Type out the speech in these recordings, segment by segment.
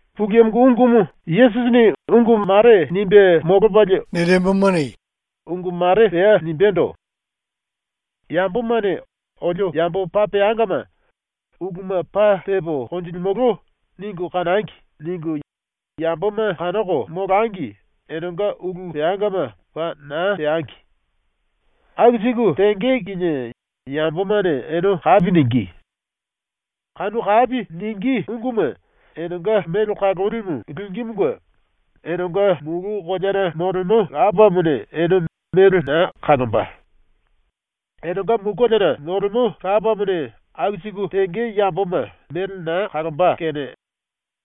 ⸤Yesusini ungu mare nimbe molopalie ungu mare pea nimbendo:⸥ “‘Yambomane ‘Olio yambo paa peangama. Uluma paa tepo konjilimolo.’ ningu kanangi.’ ningu yamboma kanoko molangi enenga ulu peangama paa na teangi. Aku siku tenge kinie yambomane ene kapi ningí. Kanu kapi ningí unguma enenga mele kalolimu lingímunge enenga mulu koleana molemo Lapamone ene mele na kalomba. “⸤Enenga mulu koleana molemo Lapamone aku siku tenge yamboma mele na kalomba⸥ kene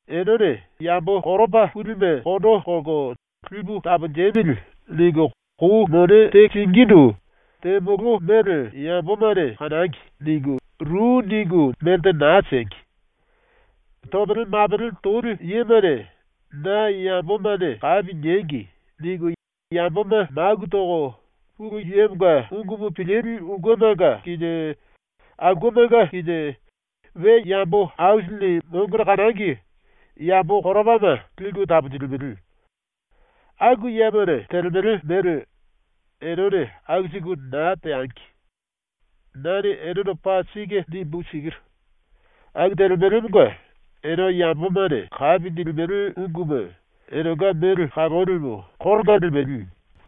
enene yambo koropa pulime kondo kolko ‘Lipu taponjemili.’ ningu kou mone te singíndu ‘Temolo mele yambomane kanangi.’ ningu, ru ningu melte naa siengi. Topele mapele toli yemane ‘Na yambomane kapi niengi.’ ningu yamboma maku toko Pulu Yemonga ungumu pilili ulkemanga kinie aulkemanga kinie we yambo aisilini mongone kanangi yambo koropama liku taponjilimele. Aku yemane telemele mele enene aku siku na teangi. Nane enendo paa sike nimbu sikiru: Aku telemelemonga ene yambomane kapi nilimele unguma enenga mele kalolimu koronga limele.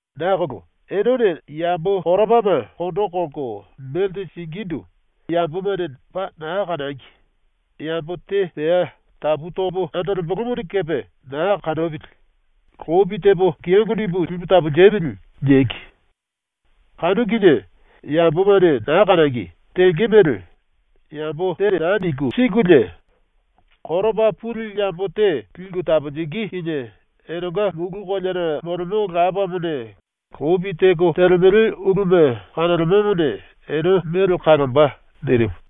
“Nakolo enene yambo koropama kondo kolko melte singíndu ‘Yambomane paa naa kanangi. Yambo te pea tapu topo andolembolomone kepe naa kanopili, lopi tepo kiyongo nimbu lipu taponjembo.’ niengi. Kanu kinie yambomane naa kanangi, tenge mele yambo te naa ningu sikulie koropa puli yambo te liku taponjingí kinie enenga ⸤mulu koleana molemo⸥ Lapamone lopi teko telemele uluma kanolemomone ene mele kalomba.” ⸤nirimu.⸥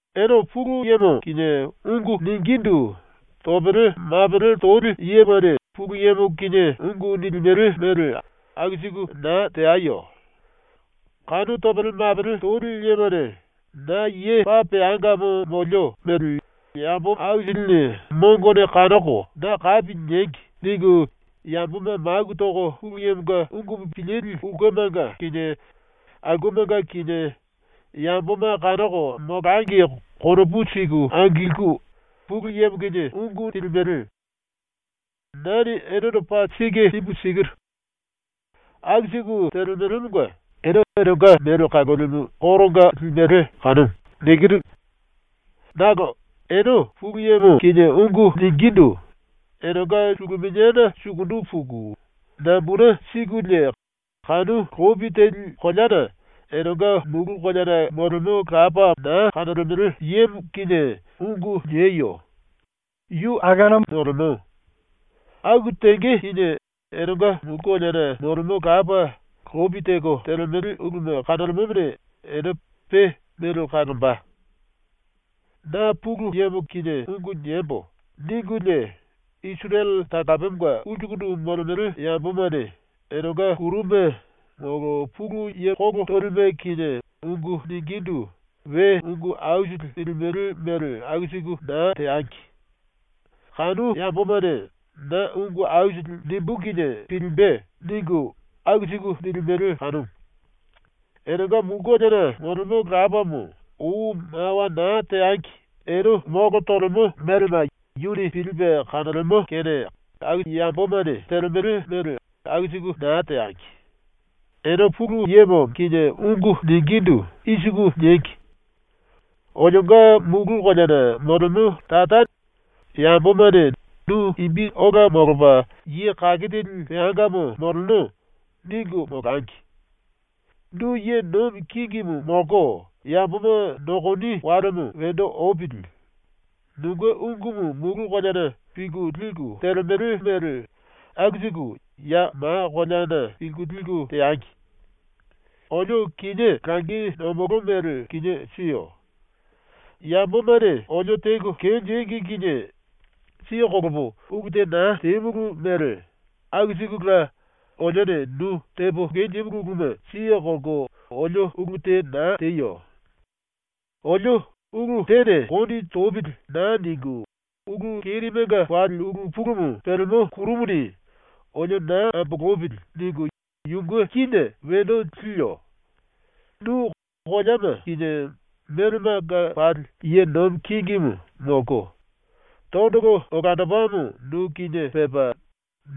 “Ene Pulu Yemo kinie ungu ningindu topele mapele toli yemane Pulu Yemo kinie ungu nilimele mele aku siku naa teayo. Kanu topele mapele toli yemane ‘Na ye paa peangamo molio mele yambo aisilini mongone kanoko na kapi niengi.’ ningu yamboma maku toko Pulu Yemonga ungu pilili ulkemanga kinie aulkemanga kinie yamboma kanoko molangi konopu siku angilku Pulu Yemo kinie ungu nilimele. Nane enendo paa sike nimbu sikiru: Aku siku telemelemonga ene enenga mele kalolimu koronga limele kanumu. Nakolo ene Pulu Yemo kinie ungu ningindu enenga suluminiana sukundu puku nambune sikulie kanu lopi teli koleana enenga ⸤mulu koleana molemo⸥ Lapa naa kanolemele yemo kinie ungu nieyo. ⸤Yu akuna molemo.⸥ Aku tenge kinie enenga ⸤mulu koleana molemo⸥ Lapa lopi teko telemele uluma kanolemomone ene pe mele kalomba. “‘Na Pulu Yemo kinie ungu niembo.’ ningulie Isirele talapemonga ulsu molemele yambomane enenga kuruma molo pulu ye kolo tolime kinie ungu ningindu we ungu aisili nilimele mele aku siku naa teangi. Kanu yambomane ‘Na ungu aisili nimbú kinie pilimbe.’ ningu aku siku nilimele kanumu. Enenga ⸤mulu koleana molemo⸥ Lapamo ou mawa naa teangi ene molo tolemo melema yuni pilipe kanolemo kene aku yambomane telemele mele aku siku naa teangi. “Ene Pulu Yemo kinie ungu ningindu i siku niengi: “Olionga mulu koleana moleno Lapamo, yambomane ‘Nu imbi ola molopa ye kake teli peangamo moleno.’ ningu molangi. Nu ye nomi kingimu molko yamboma nokoni walemo wendo opili. Nunge ungumu mulu koleana pilku liku telemele mele aku siku ya ma koleana pilku liku teangi. Olio kinié langi nomolo mele kinié siyo. Yambomane olio teko kenjíngi kinie siye kolopo ulu te na temulu mele aku sikula olione nu tepo kenjímulu uluma siye kolko olio ulu te na teyo. Olio ‘Ulu tene kondi topili.’ naa ningu ulu kerimenga pali ulu pulumu pelemo ⸤kuru⸥ muni ‘olio na ambolopili.’ ningu yunge kíne wendo liyo. (Nu koleama kinie melemanga pali ye nomi kingimu molko, tondolo olandopamo nu kinie pepa,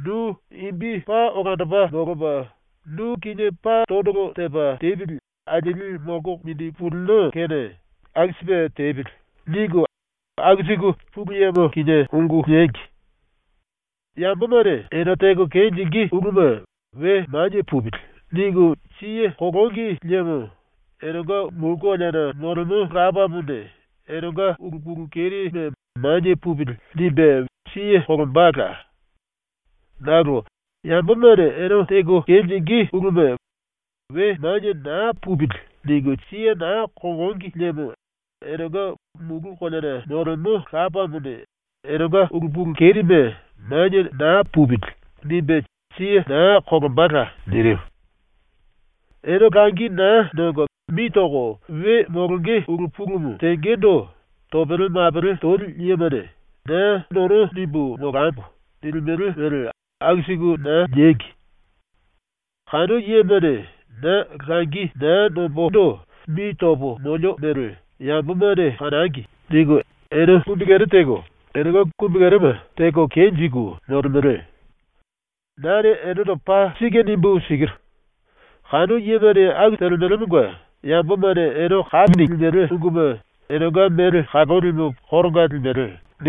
nu imbi paa olandopa molopa nu kinie pa tondolo tepa tepili alieli molko mindi pulino kene aku sipe tepili.)” ningu aku siku Pulu Yemo kinie niengi. “Yambomane ene teko kenjingí uluma ‘We manie pupili.’ ningu siye kolongi liemo enenga mulu koleana molemo Lapamone enenga ulu pulu kerime ‘Manie pupili.’ nimbe siye kolombala. Nakolo yambomane ene teko kenjingí uluma ‘We manie naa pupili.’ ningu siye naa kolongi liemo enenga ⸤mulu koleana molemo⸥ Lapamone enenga ulu pulu kerime ‘Manie naa pupili.’ nimbe siye naa kolombala.” ⸤nirimu.⸥ “Ene langi naa nongo mi toko we molonge ulu pulumu tengendo topele mapele toli yemane ‘Na nono nimbu molambo.’ nilimele mele aku siku naa niengi. Kanu yemane ‘Na langi naa nombondo mi topo molio mele yambomane kanangi.’ ningu ene kumbikere teko enenga kumbikerema teko kenjiku molemele. Nane enendo paa sike nimbu sikiru: Kanu yemane aku telemelemonga yambomane ene kapi nilimele unguma enenga mele kalolimu koronga limele.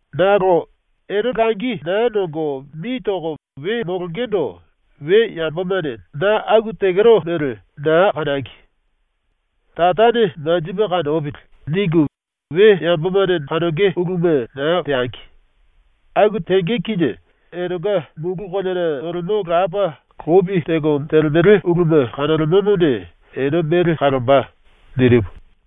“Nakolo ene langi na nongo mi toko we molongendo ‘We yambomane na aku tekero mele naa kanangi. Tarane manjipe kanopili.’ ningu we yambomane kanonge uluma naa teangi. Aku tenge kinie enenga ⸤mulu koleana molemo⸥ Lapa lopi teko telemele uluma kanolemomone ene mele kalomba.” ⸤nirimu.⸥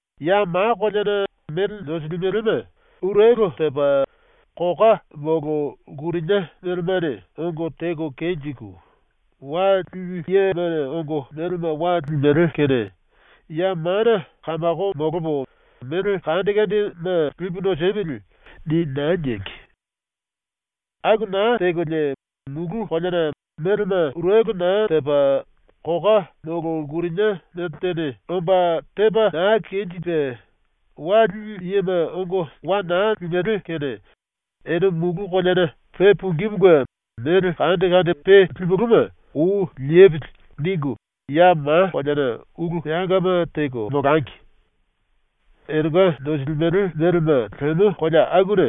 “Ya ma koleana mele nosilimelema urelo tepa koka molo lkurinia melemane ongo teko kenjiku, wa lili yema ongo melema wa limele kene ‘⸤ya mana⸥ kamako molopo mele aisili lipu nosemili.’ ni naa niengi. Aku naa tekolie mulu koleana melema urelo naa tepa koka molo lkurinia meltene omba tepa na kenjipe, wa lili yema ongo wa na limele kene ene mulu koleana ⸤pe pungímunge⸥ ‘mele aisili pe limulúma ou lepili.’ ningu ya ma koleana ulu peangama teko molangi. Enenga nosilimele melema lemo kolea akuna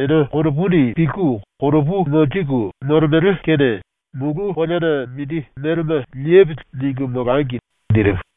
ene konopuni pilku konopu monjiku molemele kene ⸤‘mulu koleana mindi melema lepili.’ ningu molangi.” nirimu⸥.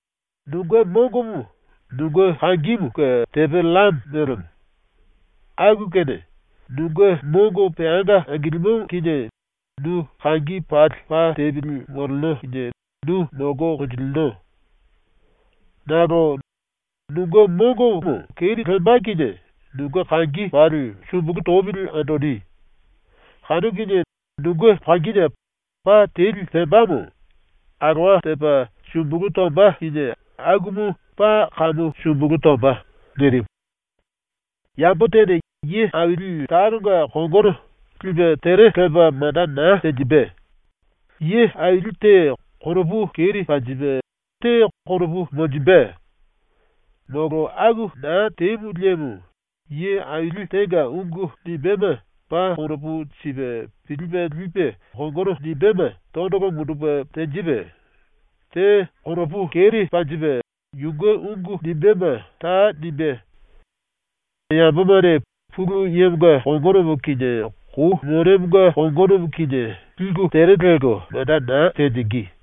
“Nunge mongomo nunge kangimunge tepe llame mélemo. Aku kene nunge mongo peanga angilimo kinie nu kangi pali pa tepili moleno kinie nu molko konjilino. Nakolo nunge mongomo keri lemba kinie nunge kangi pali sumbulu topili andoni. Kanu kinie nunge kangine pa teli pembamo alowa tepa sumbulu tomba kinie akumu paa kamu sumbulu tomba.” ⸤nirimu.⸥ “Yambo tene ye aili talonga kongono lipe tere lepa manda naa tenjimbe. Ye aili te konopu keri panjipe, te konopu monjimbe. Molo aku naa temu liemo ye aili tenga ungu nimbéma paa konopu sipe pilipe lipe kongono nimbéma tondolo mundupe tenjipe, te konopu keri panjipe yunge ungu nimbéma ta nimbé. Yambomane Pulu Yemonga kongonomo kinie Kou Monemonga kongonomo kinie liku tere lelko manda na tenjingí.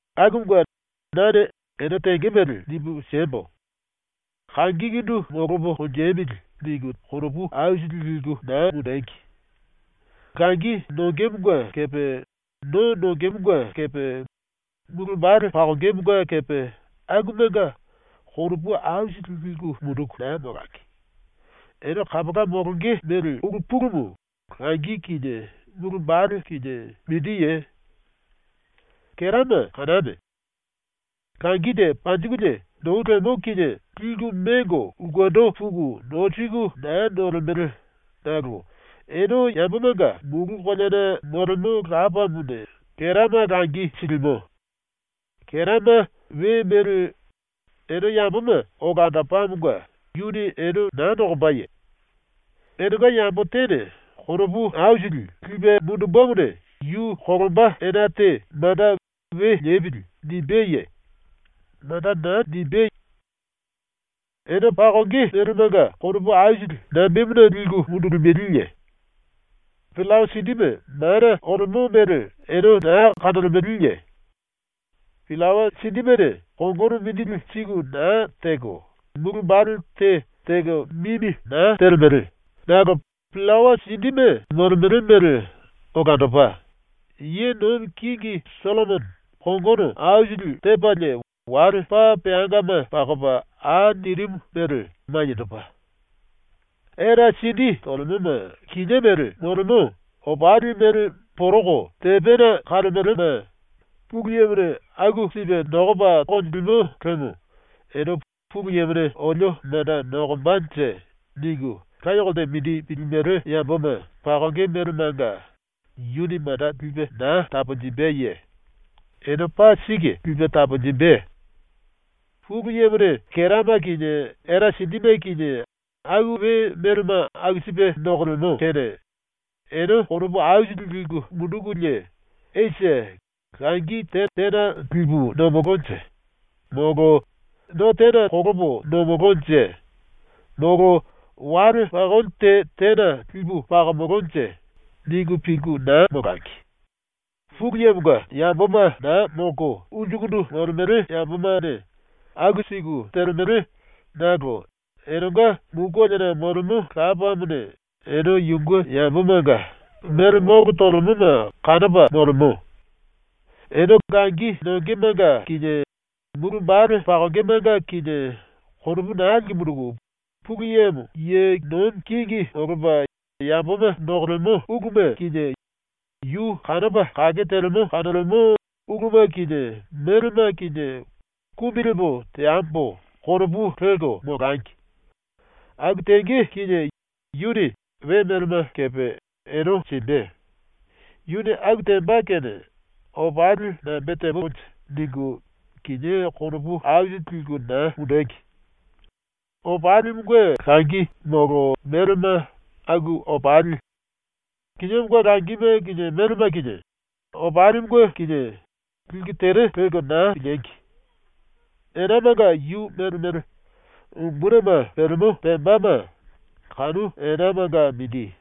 “Akumunge nane ene ⸤tenge mele⸥ nimbu siembo. ‘Kangikundu molopo konjemili.’ ningu konopu aisili liku na mundengi. Langi nongemonga kepe no nongemonga kepe mulu wambale pakongemonga kepe akumanga konopu aisili liku munduku naa molangi. Ene kapola molonge mele ulu pulumu langi kinie mulu wambale kinie mindiye? Kerama kaname. Langi te panjikulie nou lemo kinie liku mengo ulkendo puku nosiku naa nolemele nakolo ene yambomanga mulu koleana molemo Lapamone kerama langi silimo. Kerama we mele ene yamboma olandopamonga yuni ene naa nokombaye? Enenga yambo tene konopu aisili lipe mundumbemone yu kolomba ena te manda ‘We lepili.’ nimbeye? Manda naa nimbé. “Ene pakonge melemanga konopu aisili nambemuna liku mundulimeleye? Pillawa sindime mana olemo mele ene naa kanolemeleye? Pillawa sindimene kongono mindili siku na teko, mulu wambale te teko mimi naa telemele nakolo pillawa sindime molemele mele olandopa, ⸤ye nomi kingi⸥ Sollomono kongono aisili tepalie wale paa peangama pakopa au nirimu mele maniendopa. Era sindi tolemoma kinié mele molemo, opali mele poroko tepena kalemelema Pulu Yemone aku sipe nokopa konjilimo liemo ene ‘Pulu Yemone olio manda nokombanje.’ ningu laye kolte mindi pilimele yamboma pakonge melemanga yuni manda lipe naa taponjimbeye? Ene paa sike lipe taponjimbe. “⸤Pulu Yemone kerama kinie era sindime kinie aku we melema aku sipe nokolemo⸥ kene ene konopu aisili liku mundukulie ‘Esi, langi te tena lipu nomolonje?’; molo ‘No tena kolopo nomolonje?’; molo ‘Wale pakoli tena lipu pakomolonje?’ ningu pilku naa molangi. Pulu Yemonga yamboma naa molko ulsukundu molemele yambomane aku siku telemele nakolo enenga mulu koleana molemo Lapamone ene yunge yambomanga mele molo tolemoma kanopa molemo. ⸤Ene langi nongemanga kinie mulu wambale pakongemanga kinie konopu naa liku munduku,⸥ Pulu Yemo ye nomi kingi molopa yamboma nokolemo uluma kinie yu kanopa kake telemo kanolemo uluma kinie melema kinie ‘Kumbi lepo teambo.’ konopu lelko molangi. Aku tenge kinie yuni we melema kepe ene simbe. Yuni aku temba kene ‘Opali nambe tembonje?’ ningu kinié konopu aisili liku na mundengi. Opalimunge langi molo melema aku opali, kiniémonga langi molo melema kinie, opalimunge kinie, liku tere lelko naa piliengi! Enamanga yu mele mele umbunime pelemo pembama kanu enamanga mindi.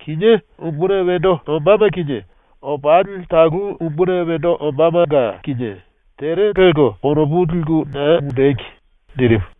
Kinié umbuni wendo ombáma kinie, opali talu umbuni wendo ombámanga kinie tere lelko konopu liku naa mundengi.” ⸤nirimu.⸥